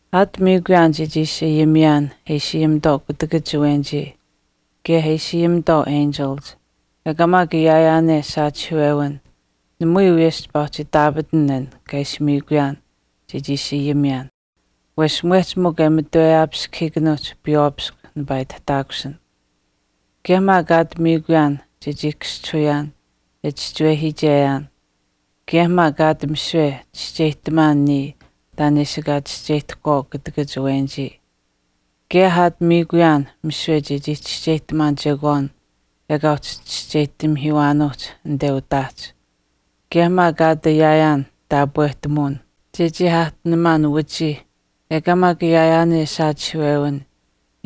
Aat miikuyaan chechii ishi ayimiyaan e ishi ayimitwaau kutakach awenichii kaye e ishi ayimitwaau enchilich, ekaa maak ayaayaan saachihiiwewin namui wiyesh chipaa uhchi itaapatan an kaa ishi miikuyaan chechii ishi ayimiyaan wesh mwehch mikw e mamatweyaapiskahiikanuuhch piywaapiskw nipaa itihtaakusin. Kaye maak aat miikuyaan chechii kaschihuyaan e chischiwehiicheyaan, kaye maak aat misiwe chischeyihtamaan niya taan e ishi ekaa chischeyihtahkwaau kutakach awenich, kaye aat miikuyaan misiwe chechii chischeyihtamaan chekwaan ekaa uhchi chischeyihtamihiiwaanuuhch anite utaahch kaye maak aat ayaayaan taapwehtamuwin chechii aahtinamaan wachiih ekaa maak ayaayaan saachihiiwewin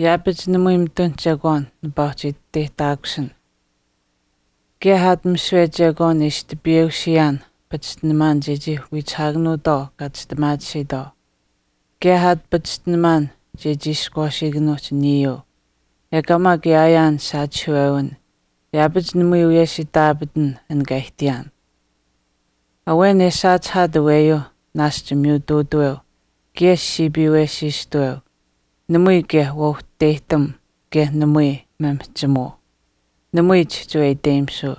yaapach namui mitun chekwaan nipaa uhchi iteyihtaakusin. Kaye aat misiwe chekwaan pachishtinamaan taan e ishi tipiyeusiyaan chechii wiichihaakanuutwaau kaa chistimaatisiitwaau, aat maak kaye pachishtinamaan chechii ishkwaasiikanuuhch niyuu, ekaa maak ayaayaan saachihiiwewin yaapach namui wiyesh itaapatan an taan kaa aihtiyaan. Awen e saachihaat aweyuu naashch miyutuutaweu kaye siipiiwesiistuweu, namui kaye waauhteyihtam kaye namui maamihchimuu, namui chihchiwe iteyimisuu,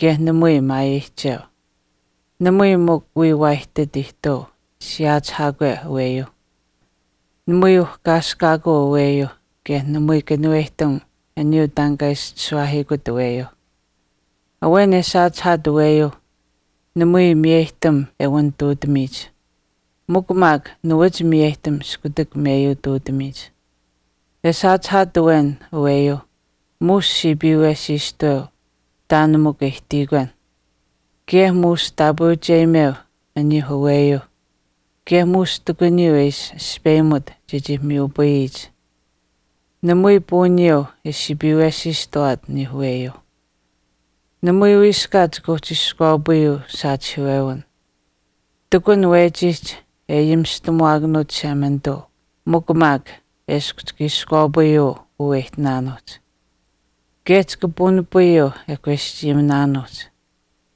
kaye namui maayeyihcheu. Namui mikw wiya waa ihtit ihtuu siyaachihaakwe aweyuuh. Namui uhkaaskaakuu aweyuuh kaye namui kanuweyihtam aniyuu taan kaa ishi chishuwaahiikut aweyuuh. Awen e saachihaat aweyuuh, namui miyeyihtam e wanituutamiich. Mikw maak nawaach miyeyihtam iskutak meyuutuutamiyich. E saachihaat awen aweyuuh muush siipiiwesiistuweu mikw taan e ihtiyikwen. Kaye muush taapweucheyimeu aniyuuh aweyuuh kaye muush ihtakuniyuu e ishi aspeyimut chechii miyupayiyich. Namui puuniyuu e siipiiwesiistuwaat aniyuuh aweyuuh. Namui wiiskaat chika uhchi iskwaapayuu saachihiiwewin. Ihtakun wechiihch e ayimistamuwaakanuut Chishemanituu mikw maak eshkw chika iskwaapayuu uu e ihtinaanuuhch. Kaye chika puunipayuu e kweschayiminaanuuhch.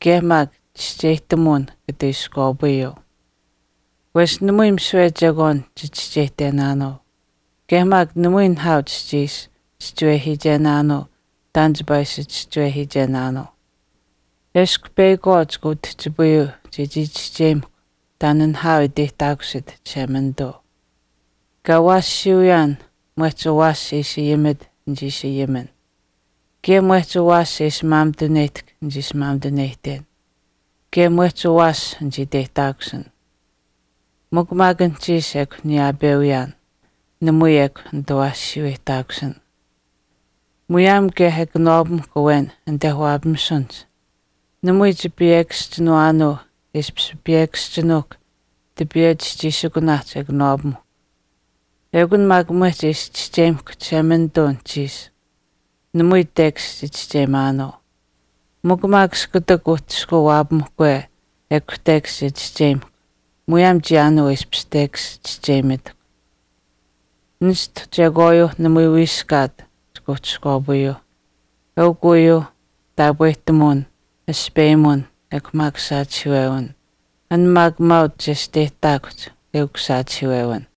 Kaye maak chischeyihtamuwin kata iskwaapayuu. Wesh namui misiwe chekwaan chichischeyihtenaanuu, kaye maak namui nihaau chichii ishi chischiwehiichenaanuu taan chipaa ishi chischiwehiichenaanuu. Eshkw peyakwaau chika utihchipayuu chechii chischeyimahkw taan nihaau e iteyihtaakusit Chishemanituu. Kaa awaashiyuuyaan, mwehch awaash e ishi ayimit nichii ishi ayimin, kaye mwehch awaash e ishi maamituneyihtahk nichii ishi maamituneyihten, kaye maak mwehch awaash nichii iteyihtaakusin. Mikw maak anuhchiish ekw niyaapeuyaan, namui ekw nitawaashuweyihtaakusin. Muyaam kaye e kanawaapamuhkw awen anite waapamisunihch, namui chipiyekaschinuwaanuu e ishpish piyekasinuuhkw tipiiwe chischiisikunaahch e kanawaapamuhkw. Ekun maak mwehch e ishi chischeyimahkw Chishemanituu anuhchiish. Namui tekash chichischeyimaanuu. Mikw maak iskutak uhchishkuu waapamahkwe ekw tekash che chischeyimahkw, muyaam chiyaanuu e ishpish tekash chischeyimitahkw. Nishtu chekwaayuu namui wiiskaat chika uhchi iskwaapayuuh, eukw uyuuh. Taapwehtamuwin, aspeyimuwin ekw maak saachihiiwewin. An maak maauch chesteyihtaakuhch eukuu saachihiiwewin.